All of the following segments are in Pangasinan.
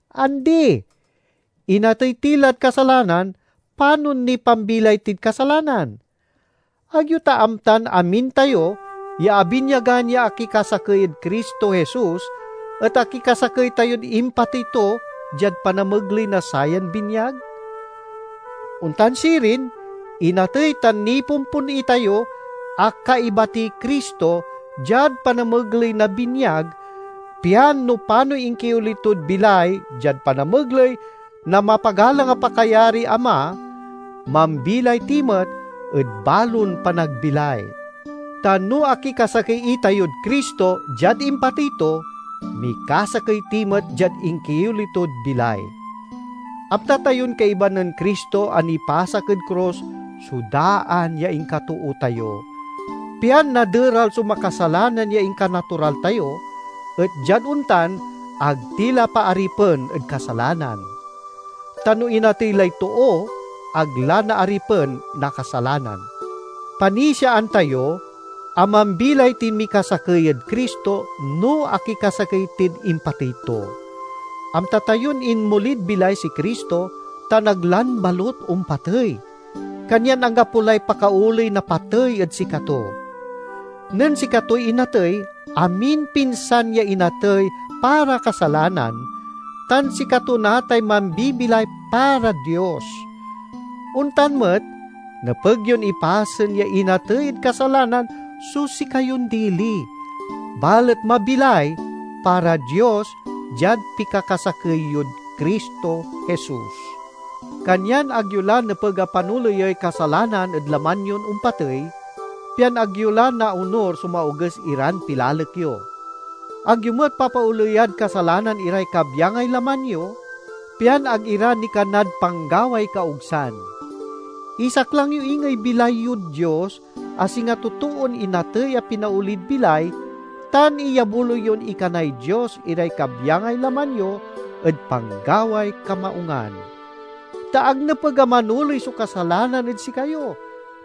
Andi! Inatey ti lad kasalanan, panon niy pambilay tid kasalanan? Ag yo ta amtan amin tayo ya abinyagan ya akikasakey ed Cristo Jesus et akikasakey tayod impatey to diad panamegley na sayan binyag? Ontan sirin, inatey tan nipompon itayo a kaiba tiy Cristo diad panamegley na binyag, pian no panoy inkioli tod bilay diad panamegley na mapagalang a pakayariy Ama, mambilay ti met ed balon panagbilay. Ta no akikasakey itayod Cristo diad impatey to, mikasakey ti met diad inkioli tod bilay. Amta tayon kaiba nen Cristo a nipasak ed krus so daan ya inkatoo tayo, pian naderal so makasalanan ya inkanatural tayo, et diad ontan ag ti la paaripen ed kasalanan. Ta no inatey lay too, ag la naaripen na kasalanan. Panisiaan tayo a mambilay tin mikasakey ed Cristo no akikasakey tid impatey to. Amta tayon inmolid bilay si Cristo tan ag lan balut ompatey, kanyan anggapo lay pakaoley na patey ed sikato. Nen sikatoy inatey, aminpinsan ya inatey para kasalanan, tan sikato natay mambibilay para Dios. Ontan met, nepeg yon ipasen ya inatey ed kasalanan so sikayon dili, balet mabilay para Dios diad pikakasakey yod Cristo Jesus. Kanyan ag yo la nepeg a panoleyey kasalanan ed laman yon ompatey, pian ag yo la naonur so maoges iran pilalek yo. Ag yo met papaoleyad kasalanan iray kabyangay laman yo, pian ag ira nikanad panggaway kaogsan. Isaklang yo ingey bilay yod Dios, a singa totoon inatey a pinaolid bilay, tan iyabuloy yon ikanay Dios iray kabyangay laman yo ed panggaway kamaungan. Ta ag nepeg a manoley so kasalanan ed sikayo,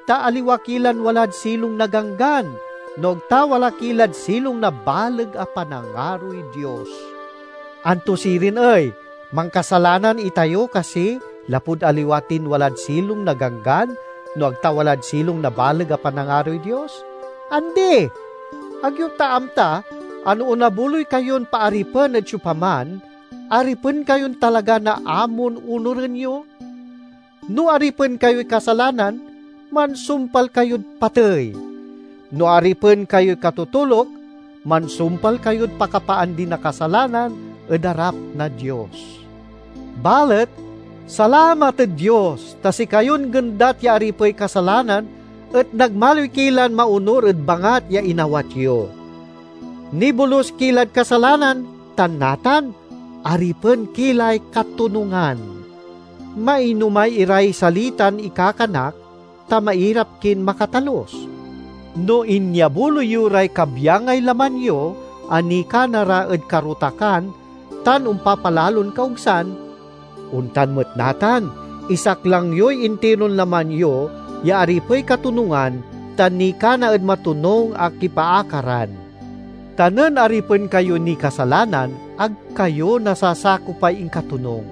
ta aliwa ki lan walad silong na ganggan, no ag ta wala ki lad silong na baleg a panangaroy Dios. Anto sirin ey, mankasalanan itayo kasi lapud aliwa tin walad silong na ganggan no ag ta walad silong na baleg a panangaroy Dios? Andi! Ag yo ta amta, a no onabuloy kayon paaripen ed siopaman, aripen kayon talaga na amon onuren yo? No aripen kayoy kasalanan, mansumpal kayod patey; no aripen kayoy katotoluk, mansumpal kayod pakapaandi na kasalanan ed arap na Dios. Balet, salamat ed Dios, ta sikayon gendat ya aripey kasalanan et nagmaliw ki lan maonur ed bangat ya inawat yo. Nibolus ki lad kasalanan tan natan, aripen ki lay katonungan. Mainomay iray salitan ikakanak, ta mairap kin makatalus. No inyabuloy yo ray kabyangay laman yo a nikana ra ed karotakan tan ompapalalon kaogsan, ontan met natan, isaklang yoy intiron laman yo ya aripey katonungan tan nikana ed matonung a kipaakaran. Ta nen aripen kayo niy kasalanan, ag kayo nasasakopay inkatonung.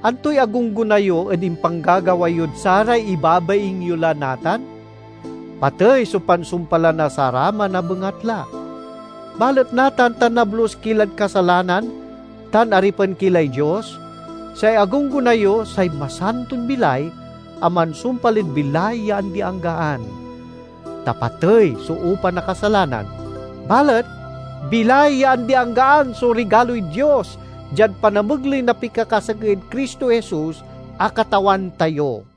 Antoy agunggona yo ed impanggagawa yod saray ibabaing yo la natan? Patey so pansumpalan na saraman a bengatla. Balet natan ta nablus ki lad kasalanan tan aripen ki lay Dios, say agunggona yo say masanton bilay a mansumpal ed bilay ya andi-anggaan. Ta patey so upa na kasalanan, balet bilay ya andi-anggaan so rigaloy Dios diad panamegley na pikakasakey ed Cristo Jesus a Katawan tayo.